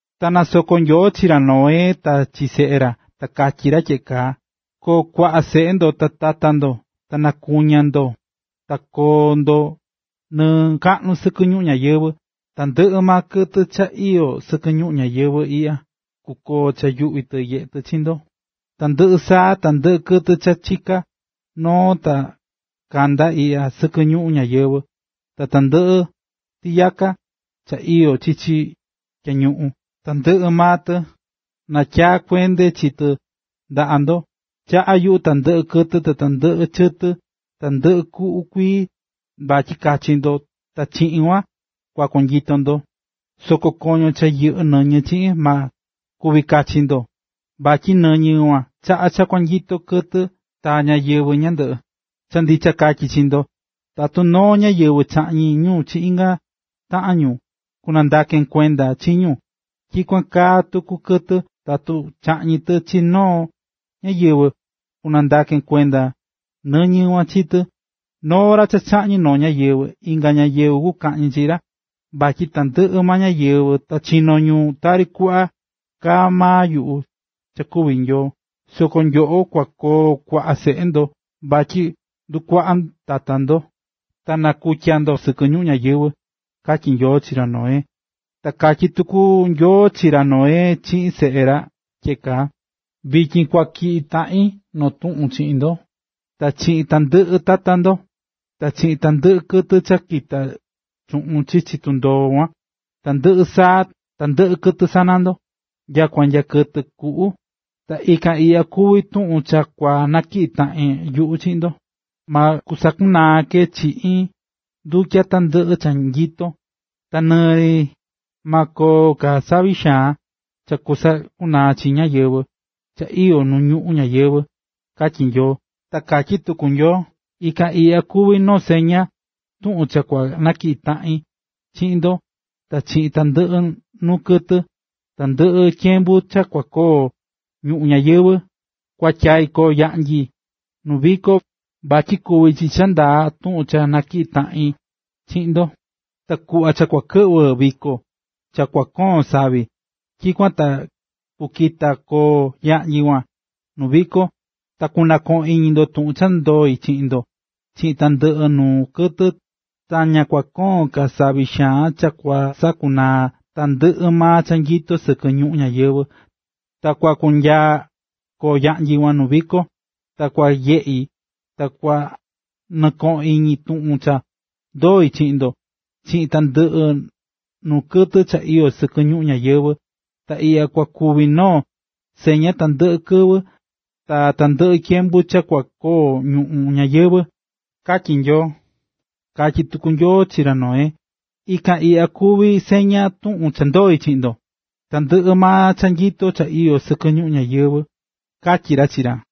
Ta nasoko̱ Nyoo chi ra Noé ta chi seꞌe ra. Ta katyí ra tyeꞌe kaa: “Ko̱o kuaꞌa seꞌe ndo ta tata ndo, ta na̱kuña ndo ta ko̱o ndo nɨɨ kaꞌnu sɨkɨ ñuꞌún ñayɨvɨ̱. Tandɨꞌɨ maa kɨtɨ cha iyó sɨkɨ ñuꞌún ñayɨvɨ̱ iꞌya kukoo cha yuꞌví tɨ nyeꞌé tɨ chi ndo, tandɨꞌɨ saa, tandɨꞌɨ kɨtɨ cha chiká noo ta kandá iꞌya sɨkɨ ñuꞌún ñayɨvɨ̱, ta tandɨꞌɨ tiyaka cha iyó chichi tyañuꞌun, tandɨꞌɨ maa tɨ natyaa̱ kuende chi tɨ ndaꞌa ndo. Chaꞌá yuꞌu tandɨꞌɨ kɨtɨ ta tandɨꞌɨ chɨtɨ, tandɨꞌɨ kuꞌu kuii, vatyi kachi ndo ta chiꞌin kuan kua konyito ndo. Soko koño cha yɨꞌɨ́ nɨñɨ, ma kuvi kachi ndo, vatyi nɨñɨ kuan chaꞌá cha konyito kɨtɨ ta ñáyɨvɨ ñandɨꞌɨ. Cha ndicha katyí chi ndo, tatu noo ñáyɨvɨ chaꞌñi̱ ñu chi inga taꞌan ñu, kunandaken kuenda chi ñu. Tyikuan kaa tuku kɨtɨ, tatu chaꞌñí tɨ chi noo ñáyɨvɨ, kunandaken kuenda nɨñɨ kuan chi tɨ. ”Noo ra cha kaꞌñi noo ñáyɨvɨ, inga ñáyɨvɨ kukaꞌñi chi ra. Vatyi tandɨꞌɨ ñáyɨvɨ ta chino̱ ñu tari kuꞌva kaá maa yuꞌu cha kuví Nyoo. Soko nyoꞌo kua koo kuaꞌa seꞌe ndo vatyi ndukuaꞌa tata ndo, ta nakutya ndo sɨkɨ ñuꞌún ñayɨvɨ̱”, katyí Nyoo chi ra Noé. Ta katyí tuku Nyoo chi ra Noé chiꞌin seꞌe ra tyeꞌe kaa: “Vityin kua tyiꞌi taꞌin noo tuꞌun chiꞌin ndo, ta chiꞌin tandɨꞌɨ tata ndo, ta chiꞌin tandɨꞌɨ kɨtɨ cha kita̱ chuꞌun chichi tundoo kuan: tandɨꞌɨ saa, tandɨꞌɨ kɨtɨ sana ndo, nyakua nya kɨtɨ kuꞌu. Ta ikan iꞌya kuvi tuꞌun cha kua natyiꞌi taꞌan yuꞌu chiꞌin ndo: Ma sakunaa ke chiꞌin ndutya tandɨꞌɨ cha nyito, ta nɨɨ ri ma koon ka savi xaan cha kusakunaa cha iyó nu ñuꞌún ñayɨvɨ̱”, katyí Nyoo. Ta katyí tuku Nyoo: “Ikan iꞌya kuví noo seña tuꞌun cha kua natyiꞌi taꞌin chiꞌin ndo, ta chiꞌin tandɨꞌɨ nuu kɨtɨ, tandɨꞌɨ tyembu cha kua koo ñuꞌún ñayɨvɨ̱: Kuatyai̱ koo yaꞌnyi nu viko, vatyi kuví chi cha ndaa tuꞌun cha natyiꞌí taꞌin chiꞌin ndo. Ta kuꞌva cha kua kɨꞌvɨ viko, cha kua koon savi, tyikuan ta kukita koo yaꞌnyi kuan nuu viko. Ta kunɨkoꞌon iñi tuꞌun cha ndoi̱ chiꞌin ndo, chiꞌin tandɨꞌɨ nuu kɨtɨ, ta ña kua koon ka savi xaan cha kusakunaa tandɨꞌɨ maa cha nyito sɨkɨ ñuꞌún ñayɨvɨ̱. Ta kua kunyaa koo yaꞌnyi kuan nuu viko, ta kua nyeꞌi ta kua nɨkoꞌon iñi tuꞌun cha ndoi̱ chiꞌin ndo, chiꞌin tandɨꞌɨ nuu kɨtɨ cha iyó sɨkɨ ñuꞌún ñayɨvɨ̱, ta iꞌya kua kuvi noo seña tandɨꞌɨ kɨvɨ, ta tandɨꞌɨ tyembu cha kua koo ñuꞌún ñayɨvɨ̱”, katyí Nyoo. Katyí tuku Nyoo chi ra Noé: “Ikan iꞌya kuví seña tuꞌun cha ndoi̱ chiꞌin tandɨꞌɨ cha nyito cha iyó sɨkɨ ñuꞌún ñayɨvɨ̱”, katyí ra chi ra.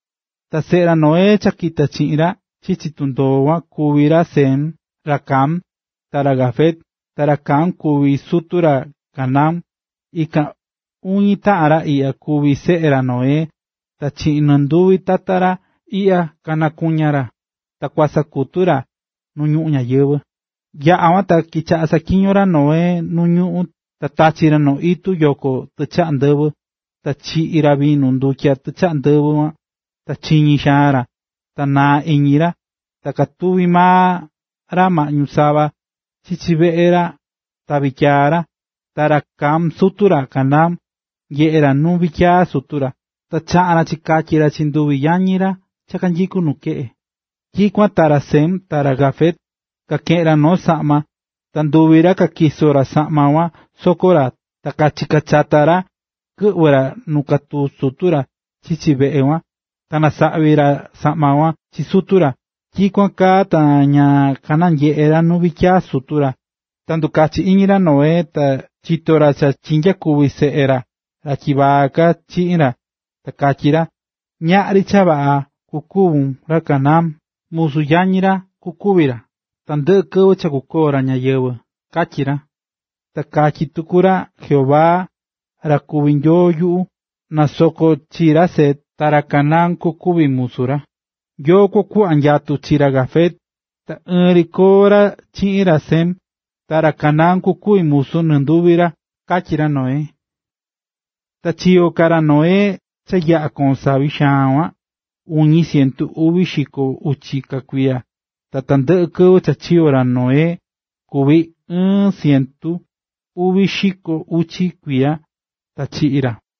Ta seꞌe ra Noé cha kita̱ chiꞌin ra chichi tundoo kuan kuví ra Sem, ra Cam, ta ra Jafet. Ta ra Cam kuví sutu ra Canaán. Ikan uñi taꞌan ra iꞌya kuví seꞌe ra Noé ta chiꞌin nɨnduñi tata ra iꞌya kanakuña̱ ra ta kasakutu̱ ra nu ñuꞌún ñayɨvɨ̱. Yaꞌa̱ kuan ta kichaꞌa̱ saꞌatyiñó ra Noé nuu ñuꞌún, ta tachi̱ ra noo itu yoꞌo tichaꞌa ndɨvɨ. Ta chiꞌi̱ ra vinu ndutya tichaꞌa ndɨvɨ kuan, ta chiñí xaan ra ta naa̱ iñi ra, ta katuví maa ra maꞌñu sava chichi veꞌe ra ta vityiyaa ra. Ta ra Cam, sutu ra Canaán, nyeꞌe̱ ra nu vityiyaa sutu ra, ta chaꞌa̱n ra chikatyi̱ ra chi nduvi yañi ra cha kanyikú nu keꞌe. Tyikuan ta ra Sem, ta ra Jafet, kakeꞌe̱n ra noo saꞌma. Ta nduvi ra katyiso̱ ra saꞌma kuan soko ra, ta kachika̱ chata ra kɨꞌvɨ̱ ra nu katuví sutu ra chichi veꞌe kuan, ta kanasaꞌvi̱ ra saꞌma kuan chi sutu ra. Tyikuan kaa ta ña kanyeꞌe̱ ra nu vityiyaa sutu ra. Cha ndukachi̱ iñi ra Noé, ta chito̱ ra cha chinyakuvi̱ seꞌe ra, ra tyivaa ka, chiꞌin ra. Ta katyí ra: “Ñaꞌri cha vaꞌa kukuvi ra Canaán musu yañi ra kukuvi ra, tandɨꞌɨ kɨvɨ cha kukoo ra ñayɨvɨ̱”, katyí ra. Ta katyí tuku ra: “Jehová, ra kuví Nyoo yuꞌu, na nasoko chi ra Sem, ta ra Canaán kukuvi musu ra. Nyoo kua kuꞌva nyatu chi ra Jafet, ta ɨɨn ri koo ra chiꞌin ra Sem. ta ra Canaán kukuvi musu nɨnduvi ra”, katyí ra Noé. Ta chiyo̱ ka ra Noé cha yaꞌa̱ koon savi xaan kuan, uñi cientu uvi xiko uchi ka kuiya. Ta tandɨꞌɨ kɨvɨ cha chiyo̱ ra Noé kuvi̱ ɨɨn cientu uvi xiko uchi kuiya, ta chiꞌi̱ ra.